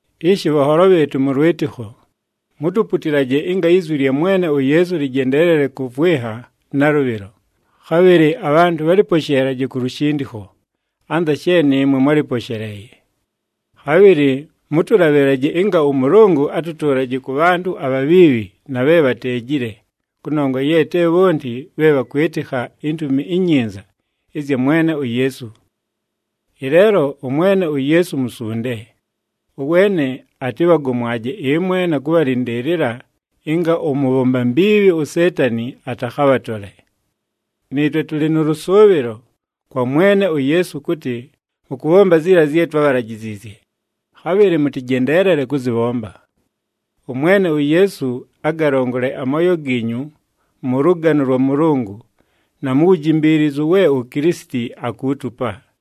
Ishi bhanholo bhɨɨtʉ mʉ lwɨtɨkho, mutuputilaje ɨnga izwi lya Mwene uYeesu lɨjendeelele kʉvwɨnha nalʉbhɨlo, khabhɨlɨ abhantʉ bhalɨposheelaje ku lushindikho, anza she nɨɨmwe mwálɨposheleeye. Khabhɨlɨ mʉtʉlabhɨlaje ɨnga ʉMʉlʉngʉ atʉtʉʉlaje kʉ bhantʉ abhabhiibhi na bhe bhateejile, kʉnongwa ye te bhonti bhe bhakwɨtɨkha iNtumi iNyinza ɨzya Mwene uYeesu. Ɨleelo ʉMwene uYeesu musunde, ʉweene atɨbhagomwaje ɨmwe na kʉbhalɨndɨɨlɨla ɨnga ʉmʉbhomba mbiibhi uSeetani atakhabhatole. Nɨɨtwe tʉlɨ nʉ lʉsʉʉbhɨlo kwa Mwene uYeesu kʉtɨ mʉkʉbhomba ziila zye twábhalajiziizye, khabhɨlɨ mʉtɨjendeelele kʉzɨbhomba. ɄMwene uYeesu agalongole amooyo giinyu mʉ lʉgano lwa Mʉlʉngʉ na mu wujimbiilizu we uKilisiti akuutupa.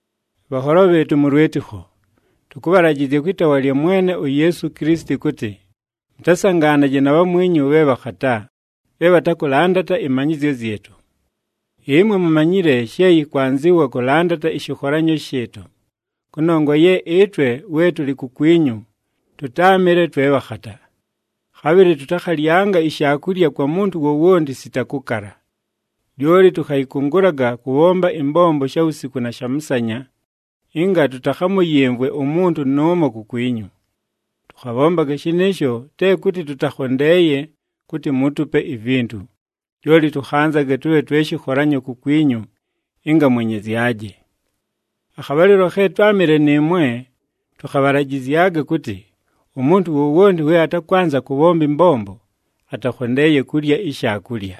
Bhanholo bhɨɨtʉ mʉ lwɨtɨkho, tʉkʉbhalajɨzya kwɨ taawa lya Mwene uYeesu Kilisiti kʉtɨ, mʉtasangaanaje na bhamwinyu bhe bhakhata, bhe bhatakʉlandata ɨmanyɨzyo zyɨtʉ. Ɨmwe mumanyile she yɨkwanzɨwa kʉlandata ɨshɨkholanyo shɨɨtʉ, kʉnongwa ye ɨtwe we tʉlɨ kukwinyu tʉtáamɨle twe bhakhata. Khabhɨlɨ tʉtakhalyanga ishaakulya kwa muntu wowonti sita kʉkala. Lyoli tʉkhayɨkʉngʉlaga kʉbhomba ɨmbombo shawusiku na shamʉsanya, ɨnga tʉtakhamʉyɨmvwe umuntu nʉʉmo kukwinyu. Tʉkhabhombaga shɨnɨɨsho te kʉtɨ tʉtakhondeeye kʉtɨ muutupe ivintu, lyoli tʉkhanzaga tʉbhe twe shɨkholanyo kukwinyu ɨnga mwenyezyaje. Akhabhalɨlo khe twámɨle nɨɨmwe tʉkhabhalajɨzyaga kʉtɨ, “Umuntu wowonti we atakwanza kʉbhomba ɨmbombo atakhondeeye kulya ishaakulya.”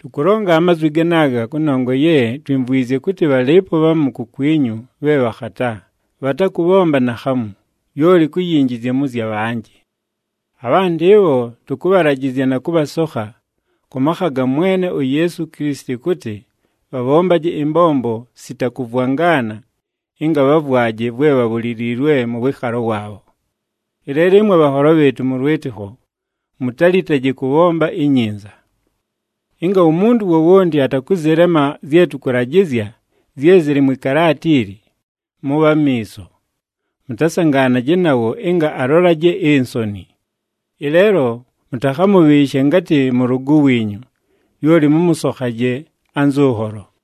Tʉkʉlonga amazwi ganaaga kʉnongwa ye twimvwizye kʉtɨ bhalɨɨpo bhamu kukwinyu bhe bhakhata, bhatakʉbhomba naakhamu, lyoli kuyinjizya mʉ zya bhanjɨ. Abhantʉ ɨbho tʉkʉbhalajɨzya na kʉbhasokha kʉ makha ga Mwene uYeesu Kilisiti kʉtɨ bhabhombaje ɨmbombo sita kʉvwangana ɨnga bhavwaje vwe bhabhuliliilwe mʉ wɨɨkhalo waabho. Ɨleelo ɨmwe bhanholo bhɨɨtʉ mʉ lwɨtɨkho, mutalitaje kʉbhomba inyinza. Ɨnga umuntu wowonti atakʉzɨlema zye tʉkʉlajɨzya, zye zɨlɨ mwɨ kalaata ili, mʉbhe amiiso, mʉtasangaanaje nawo ɨnga alolaje insoni. Ɨleelo mʉtakhamʉbhɨɨshe ngatɨ mʉlʉgʉ wiinyu, lyoli mʉmʉsokhaje anzʉ nholo.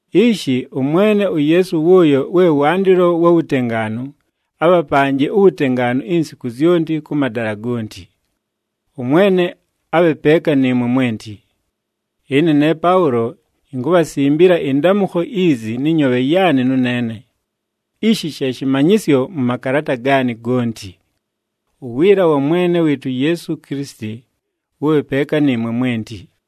Ishi, ʉMwene uYeesu wʉʉyo we wandɨlo wa wutengaanu, abhapanje uwutengaanu insiku zyonti kʉ madala gonti. ɄMwene abhe peeka nɨɨmwe mwenti. Ɨne ne Paʉlo inkubhasimbila ɨndamʉkho izi nɨ nyoobhe yaanɨ nʉneene. Ishi she shɨmanyɨsyo mʉ makalaata gaanɨ gonti. Uwiila wa Mwene wɨɨtʉ uYeesu Kilisiti wʉbhe peeka nɨɨmwe mwenti.